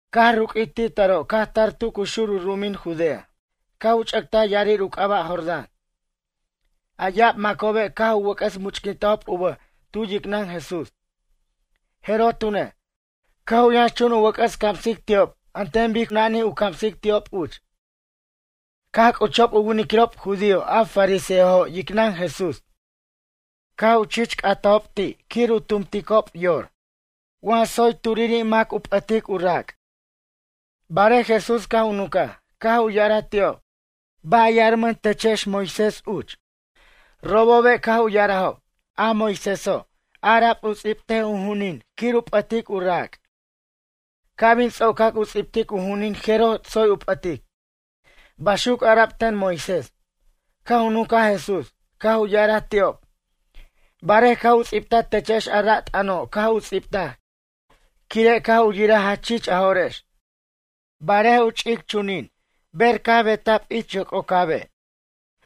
Caj ruq'uij ti' taro' caj tar tu cu xur u ru'umin Judea caj u ch'ʌtaj ya'arir u c'aba' Jordán. A ya'ab macobe' caj u wʌc'ʌs much'quintajob u bʌj tu yicnʌn Jesús. Jeroj tune', caj u yʌnxchun u wʌc'ʌs camsic ti'ob an ten bic cu nanij u camsic ti'ob uch. Caj c'uchob u winiquirob judío a fariseojo' yicnʌn Jesús, caj u chich c'atajob ti' quir u tumticob yor, wa tsoy turiri' mam u p'ʌtic u rac'. Barej Jesús caj u nuncaj, caj u ya'araj ti'ob: ―Ba' yarmʌn techex Moisés uch? Robobe' caj u ya'arajob: ―A Moisése' ara'b u ts'ibtej u ju'unin quir u p'ʌtic u rac'. Ca' bin ts'ocac u ts'ibtic u ju'unin jeroj tsoy u p'ʌtic. Baxuc ara'b ten Moisés. Caj u nuncaj Jesús, caj u ya'araj ti'ob: ―Barej caj u ts'ibtaj techex a ra' t'ʌno' caj u ts'ibtaj quire' caj u yiraj jach chich a jo'rex. Barej u ch'ic chunin ber caj beta'b ich yoc'ocabe',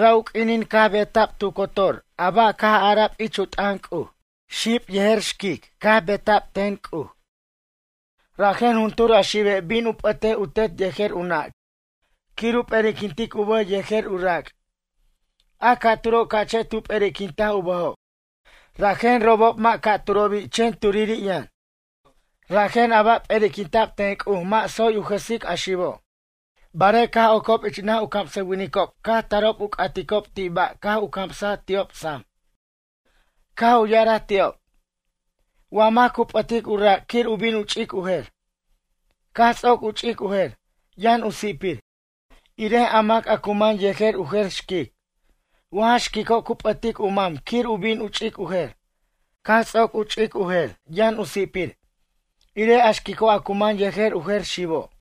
ra' u q'uinin caj beta'b tu cotor a ba', caj ara'b ich u t'ʌn C'uj: “Xib yejer xquic caj beta'b ten C'uj.” “Rajen juntur a xibe' bin u p'ʌtej u tet yejer u nʌ' quir u p'eriquintic u bʌj yejer u rac'. A ca'turo' ca'che' tu p'eri'quintaj u bʌjob.” Rajen robob mʌ' ca'turobi' chen turiri' yʌn. Rajen a ba' p'eriquinta'b ten C'uj mʌ' tsoy u jʌsic a xibo'. Barej caj ocob ich naj u camsʌwinicob caj tarob u c'aticob ti' ba' caj u camsaj ti'ob sam. Caj u ya'araj ti'ob: ―Wa mac cu p'ʌtic u rac' quir u bin u ch'ic u jer, caj ts'oc u ch'ic u jer, yʌn u si'pir, irej a mac a cu man yejer u jer xquic. Wa ja xquico' cu p'ʌtic u mam quir u bin u ch'ic u jer, caj ts'oc u ch'ic u jer, yʌn u si'pir, irej a xquico' a cu man yejer u jer xibo'.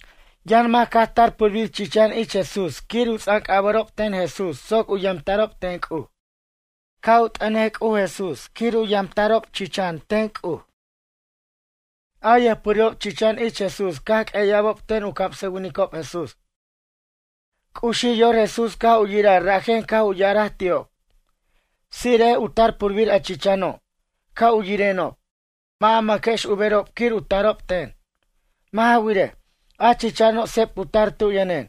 Yʌn mac caj tar purbir chichan ich Jesús quir u ts'anc'ʌba'rob ten Jesús soc u yamta'rob ten C'uj. Caj u t'ʌnej C'uj Jesús quir u yamta'rob chichan ten C'uj. A yʌjpurirob chichan ich Jesús caj q'ueya'bob ten u camsʌwinicob Jesús. C'uxij yor Jesús caj u yiraj rajen caj u ya'araj ti'ob: ―Tsire'ej u tar purbir a chichano', ca' u yirenob. Mʌ' a mʌquex u berob quir u tarob ten. Mʌ' ja wirej, a chichano' seb cu tar tu yʌnen.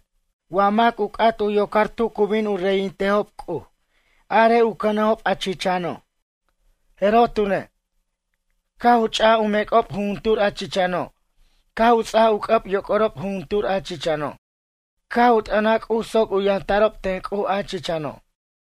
Wa mac u c'at u yocar tu cu bin u reyintejob C'uj arej u cʌnejob a chichano'. Jeroj tune', caj u ch'aj u mec'ob jujuntur a chichano' caj u ts'aj u c'ʌb yoc'orob jujuntur a chichano' caj u t'ʌnaj C'uj soc u yamta'rob ten C'uj a chichano'.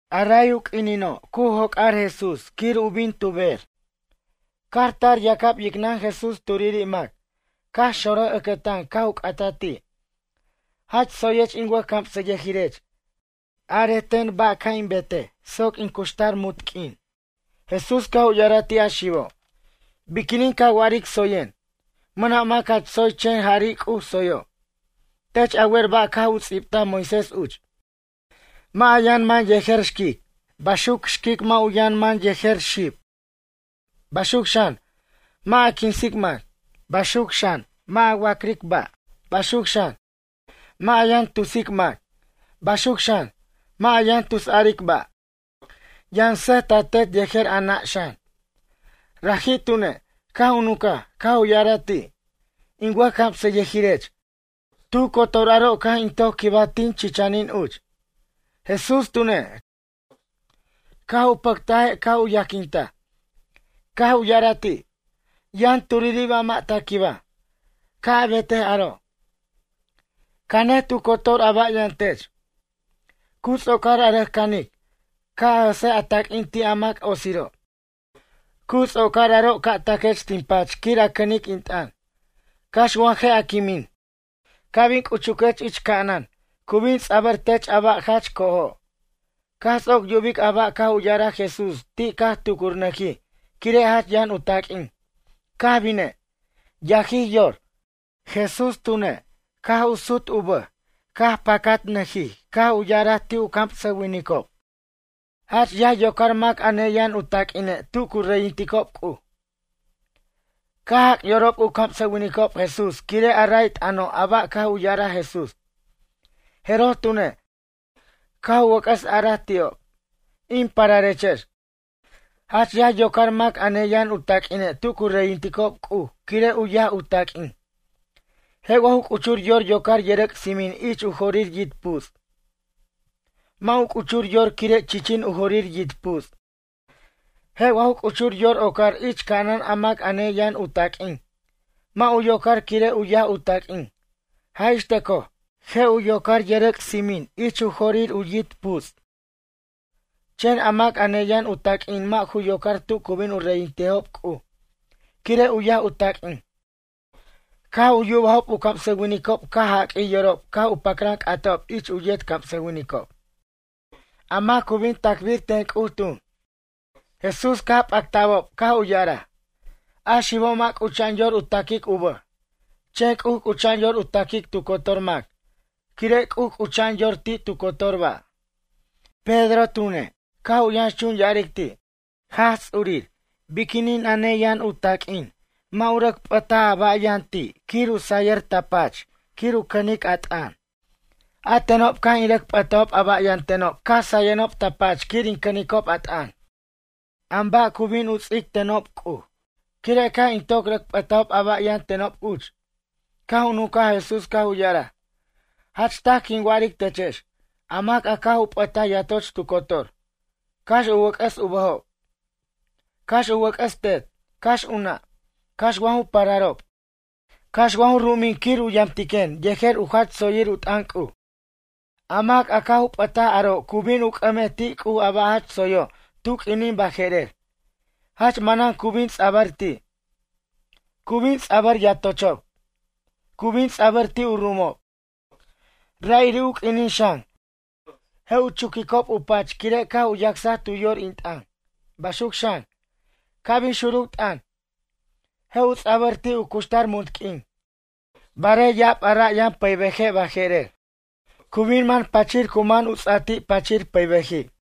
A ray u q'uinino' cu joc'ar Jesús quir u bin tu bej, caj tar yacab yicnʌn Jesús turiri' mac, caj xonraj ʌcʌtan caj u c'ataj ti': ―Jach tsoyech in wʌjcamsʌyʌjirech. Arej ten ba' ca' in betej soc in cuxtar munt q'uin? Jesús caj u ya'araj ti' a xibo': ―Biquinin ca wa'aric tsoyen? Mʌna' mac jach tsoy chen jari' C'uj tsoyo'. Tech a wer ba' caj u ts'ibtaj Moisés uch: “Mʌ' a yʌn man yejer xquic, baxuc xquic mʌ' u yʌn man yejer xib. Baxuc xan, mʌ' ja quinsic mac. Baxuc xan, mʌ' a wa'cric ba'. Baxuc xan, mʌ' a yʌn tusic mac. Baxuc xan, mʌ' a yʌn tusaric ba'. Yʌn sʌj ta tet yejer a nʌ' xan.” Raji' tune', caj u nuncaj, caj u ya'araj ti': ―In wʌjcamsayʌjirech, tu cotor aro' caj in toc quibaj tin chichʌnin uch. Jesús tune', caj u pʌctaje' caj u yajquintaj, caj u ya'araj ti': ―Yʌn turiri' ba' mʌ' ta quibaj, ca' a betej aro'. Canej tu cotor a ba' yʌn tech. Cu ts'ocar a rʌc canic, ca' a jʌsej a taq'uin ti' a mac otsiro'. Cu ts'ocar aro' ca' taquech tin pach quir a cʌnic in t'ʌn, cax wa je' a quimin. Ca' bin c'uchuquech ich ca'anan, cu bin ts'abʌr tech a ba' jach co'ojo'. Caj ts'oc yubic a ba' caj u ya'araj Jesús ti' caj tucurnʌjij quire' jach yʌn u taq'uin. Caj bine', yajij yor. Jesús tune', caj sut u bʌj caj pacatnʌjij caj u ya'araj ti' u camsʌwinicob: ―Jach yaj yocar mac a neyʌn u taq'uine' tu cu reyinticob C'uj. Caj jac' yorob u camsʌwinicob Jesús quire' a ray t'ʌno' a ba' caj u ya'araj Jesús. Jeroj tune', caj u wʌc'ʌs araj ti'ob: ―In pararechex, jach yaj yocar mac a neyʌn u taq'uine' tu cu reyinticob C'uj quire' u yaj u taq'uin. Je' wa ju c'uchur yor yocar yʌrʌc' tsimin ich u jorir yit' puts'? Mʌ' u c'uchur yor quire' chichin u jorir yit' puts'. Je' wa ju c'uchur yor ocar ich ca'anan a mac a ne yʌn u taq'uin? Mʌ' u yocar quire' u yaj u taq'uin. Jaj ix tʌcoj, je' u yocar yʌrʌc' tsimin ich u jorir u yit' puts'. Chen a mac a neyan u taq'uin mʌ' ju yocar tu cu bin u reyintejob C'uj quire' u yaj u taq'uin. Caj u yubajob u camsʌwinicob caj jaq'uij yorob caj u pacran c'atajob ich u yet camsʌwinicob: ―A mac cu bin tacbir ten C'uj tun? Jesús caj pacta'bob caj u ya'araj: ―A xibo' mʌ' c'ucha'an yor u taquic u bʌj, chen C'uj c'ucha'an yor u taquic tu cotor mac, quire' C'uj c'ucha'an yor ti' tu cotor ba'. Pedro tune', caj u yʌnxchun ya'aric ti': ―Jaj Ts'urir biquinin a neyʌn u taq'uin mʌ' u rʌc p'ʌtaj a ba' yʌn ti' quir u say ta pach quir u cʌnic a t'ʌn? A tenob caj in rʌc p'ʌtajob a ba' yʌntenob caj sayenob ta pach quir in cʌnicob a t'ʌn. An ba' cu bin u ts'ic tenob C'uj, quire' caj in toc rʌc p'ʌtajob a ba' yʌn tenob uch? Caj u nuncaj Jesús caj u ya'araj: ―Jach taj quin wa'aric techex. A mac a caj u p'ʌtaj yatoch tu cotor, cax u wʌc'ʌs u bʌjob, cax u wʌc'ʌs tet, cax u nʌ', cax wa ju pararob, cax wa ju ru'umin quir u yamtiquen yejer u jach tsoyir u t'ʌn C'uj. A mac a caj u p'ʌtaj aro' cu bin u c'ʌmej ti' C'uj a ba' jach tsoyo' tu q'uinin baje'rer, jach manan cu bin ts'abʌr ti'. Cu bin ts'abʌr yatochob. Cu bin ts'abʌr ti' u ru'umob. Ra'iri' u q'uinin xan, je' u chuquicob u pach quire' caj u yacsaj tu yor in t'ʌn. Baxuc xan, ca' bin xuruc t'ʌn, je' u ts'abʌr ti' u cuxtar munt q'uin. Barej ya'ab a ra' yʌn pʌybeje' baje'rer, cu bin man pachir cu man u ts'ati' pachir pʌybeji'.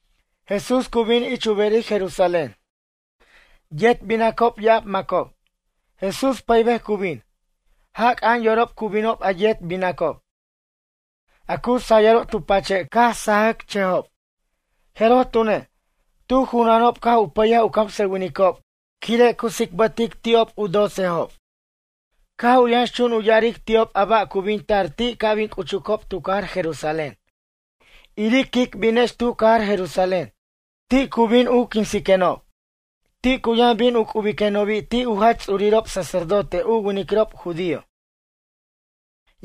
Jesús cu bin ich u berir Jerusalén, yet binacob ya'ab macob. Jesús pʌybej cu bin. Jac'a'an yorob cu binob a yet binacob, a cu sayʌrob tu pache' caj sajʌcchʌjob. Jeroj tune', tu junanob caj u pʌyaj u camsʌwinicob quire' u tsicbʌtic ti'ob u docejob. Caj u yʌnxchun u ya'aric ti'ob a ba' cu bin tar ti' ca' bin c'uchucob tu cajar Jerusalén: ―Iric quic binex tu cajar Jerusalén. Ti' cu bin u quinsiquenob. Ti' cu yʌn bin u c'ubiquenobi' ti' u jach ts'urirob sacerdote u winiquirob judío,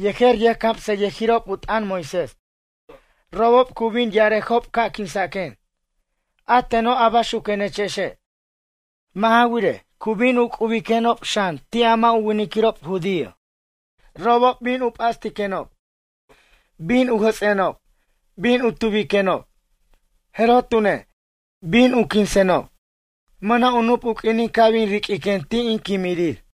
yejer yʌjcamsʌyʌjirob u t'ʌn Moisés. Robob cu bin ya'arejob ca' quinsaquen, a teno' a baxuquenechexe'. Mʌ' ja wirej, cu bin u c'ubiquenob xan ti' a mʌ' u winiquirob judío. Robob bin u p'astiquenob, bin u jʌts'enob, bin u tubiquenob, jeroj tune', bin u quinsenob. Mʌna' u nup u q'uinin ca' bin riq'uiquen ti' in quimirir.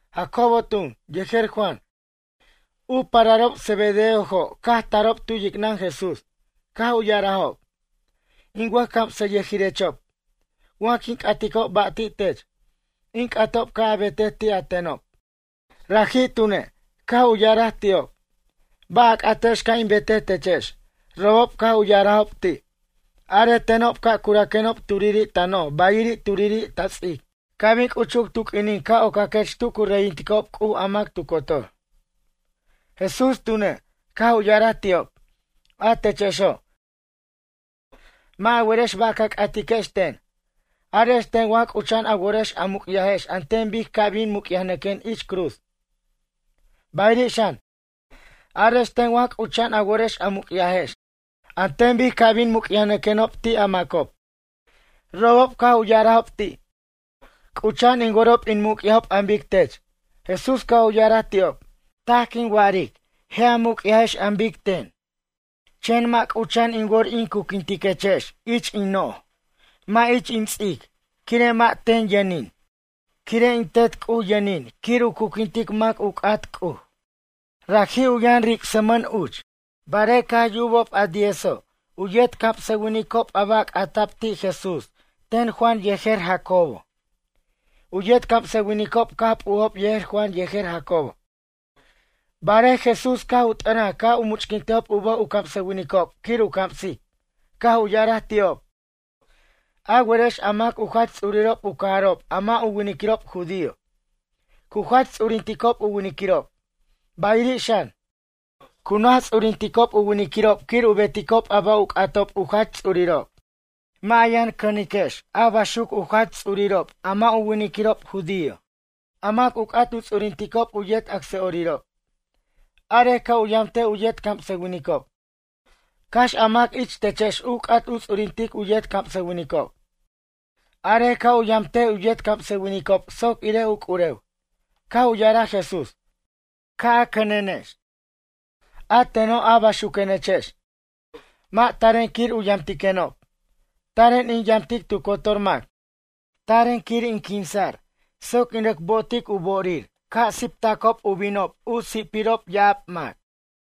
Jacobo tun, yejer Juan, u pararob Zebedeojo' caj tarob tu yicnʌn Jesús, caj u ya'arajob: ―In wʌjcamsayʌjirechob, wa quin c'aticob ba' ti' tech, in c'atob ca' a betej ti' a tenob. Raji' tune', caj u ya'araj ti'ob: ―Ba' a c'atex ca' in betej techex? Robob caj u ya'arajob ti': ―Arej tenob ca' curaquenob turiri' ta noj bayiri' turiri' ta ts'ic ca' bin c'uchuc tu q'uinin ca' ocaquech tu cu reyinticob C'uj a mac tu cotor. Jesús tune', caj u ya'araj ti'ob: ―A techexo', mʌ' a werex ba' ca c'atiquex ten. Arex ten wa c'ucha'an a worex a muc'yajex an ten bic ca' bin muc'yajnʌquen ich cruz? Bayiri' xan, arex ten wa c'ucha'an a worex a muc'yajex an ten bic ca' bin muc'yajnʌquenob ti' a macob? Robob caj u ya'arajob ti': ―C'ucha'an in worob in muc'yajob an bic tech. Jesús caj u ya'araj ti'ob: ―Taj quin wa'aric. Je' a muc'yajex an bic ten. Chen mʌ' c'ucha'an in wor in curquintiquechex ich in noj mʌ' ich in ts'ic quire' mʌ' ten yʌnin. Quire' in Tet C'uj yʌnin quir u curquintic mac u c'at C'uj. Raji' u yʌn ricsmʌn uch. Barej caj yubob a diezo' u yet camsʌwinicob a ba' c'ata'b ti' Jesús ten Juan yejer Jacobo. U yet camsʌwinicob caj p'ujob yejer Juan yejer Jacobo. Barej Jesús caj u t'ʌnaj ca' u much'quintejob u bʌj u camsʌwinicob quir u camsic, caj u ya'araj ti'ob: ―A werex a mac u jach ts'urirob u cajarob a mʌ' u winiquirob judío, cu jach ts'uririnticob u winiquirob. Bayiri' xan, cu naj ts'uririnticob u winiquirob quir u beticob a ba' u c'atob u jach ts'urirob. Mʌ' a yʌn cʌniquex a baxuc u jach ts'urirob a mʌ' u winiquirob judío, a mac u c'at u ts'uririnticob u yet acsa'orirob. Arej ca' u yamtej u yet camsʌwinicob. Cax a mac ich techex u c'at u ts'uririntic u yet camsʌwinicob, arej ca' u yamtej u yet camsʌwinicob soc irej u c'urew. Caj u ya'araj Jesús: ―Ca' a cʌniquenex, a teno' a baxuquenechex. Mʌ' taren quir u yamtiquenob. Taren in yamtic tu cotor mac. Taren quir in quinsa'r soc in rʌc bo'otic u bo'orir ca' siptacob u binob u si'pirob ya'ab mac.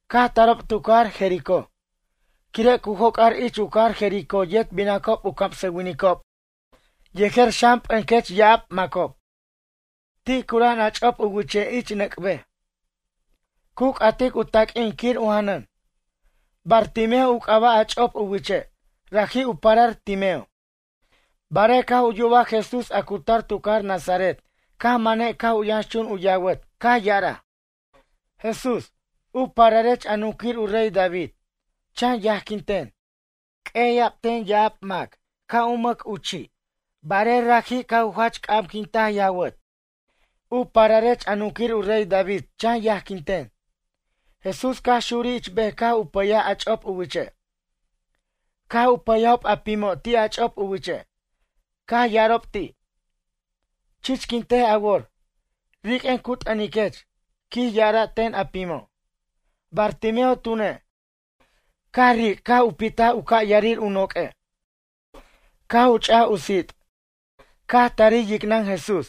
Caj tarob tu cajar Jericó. Quire' cu joc'ar ich u cajar Jericó yet binacob u camsʌwinicob yejer xan p'encʌch ya'ab macob, ti' cura'an a ch'op u wiche' ich nʌc' bej. Cu c'atic u taq'uin quir u janʌn. Bartimeo u c'aba' a ch'op u wiche', raji' u parar Timeo. Barej caj u yubaj Jesús a cu tar tu cajar Nazaret caj mane' caj u yʌnxchun u yawʌt caj ya'araj: ―Jesús, u pararech a nunquir u rey David, chan yajquin ten. Q'ueya'b ten ya'ab mac ca' u mʌc u chi'. Barej raji' caj u jach c'amquintic awʌt: ―U pararech a nunquir u rey David chan yajquin ten. Jesús caj xurij ich bej caj u pʌyaj a ch'op u wiche'. Caj u pʌyajob a pimo' ti' a ch'op u wiche', caj ya'arob ti': ―Chichquintej a wor, riq'uen cu t'ʌniquech ―quij ya'ara' ten a pimo'. Bartimeo tune', caj ric' caj u pitaj u ca' ya'arir u noq'ue', caj u ch'aj u sit', caj tarij yicnʌn Jesús.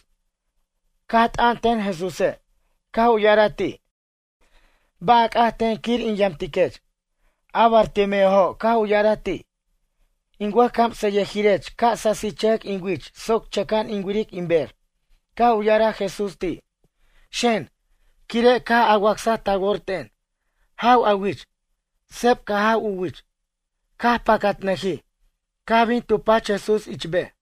Caj t'ʌn ten Jesúse', caj u ya'araj ti': ―Ba' a c'at ten quir in yamtiquech? A Bartimeojo' caj u ya'araj ti': ―In wʌj camsʌyʌjirech ca' sasichʌjʌc in wich soc chʌca'an in wiric in ber. Caj u ya'araj Jesús ti': ―Xen, quire' caj a wacsaj ta wor ten, jaw a wich. Seb caj jaw u wich, caj pacatnʌjij, caj bin tu pach Jesús ich bej.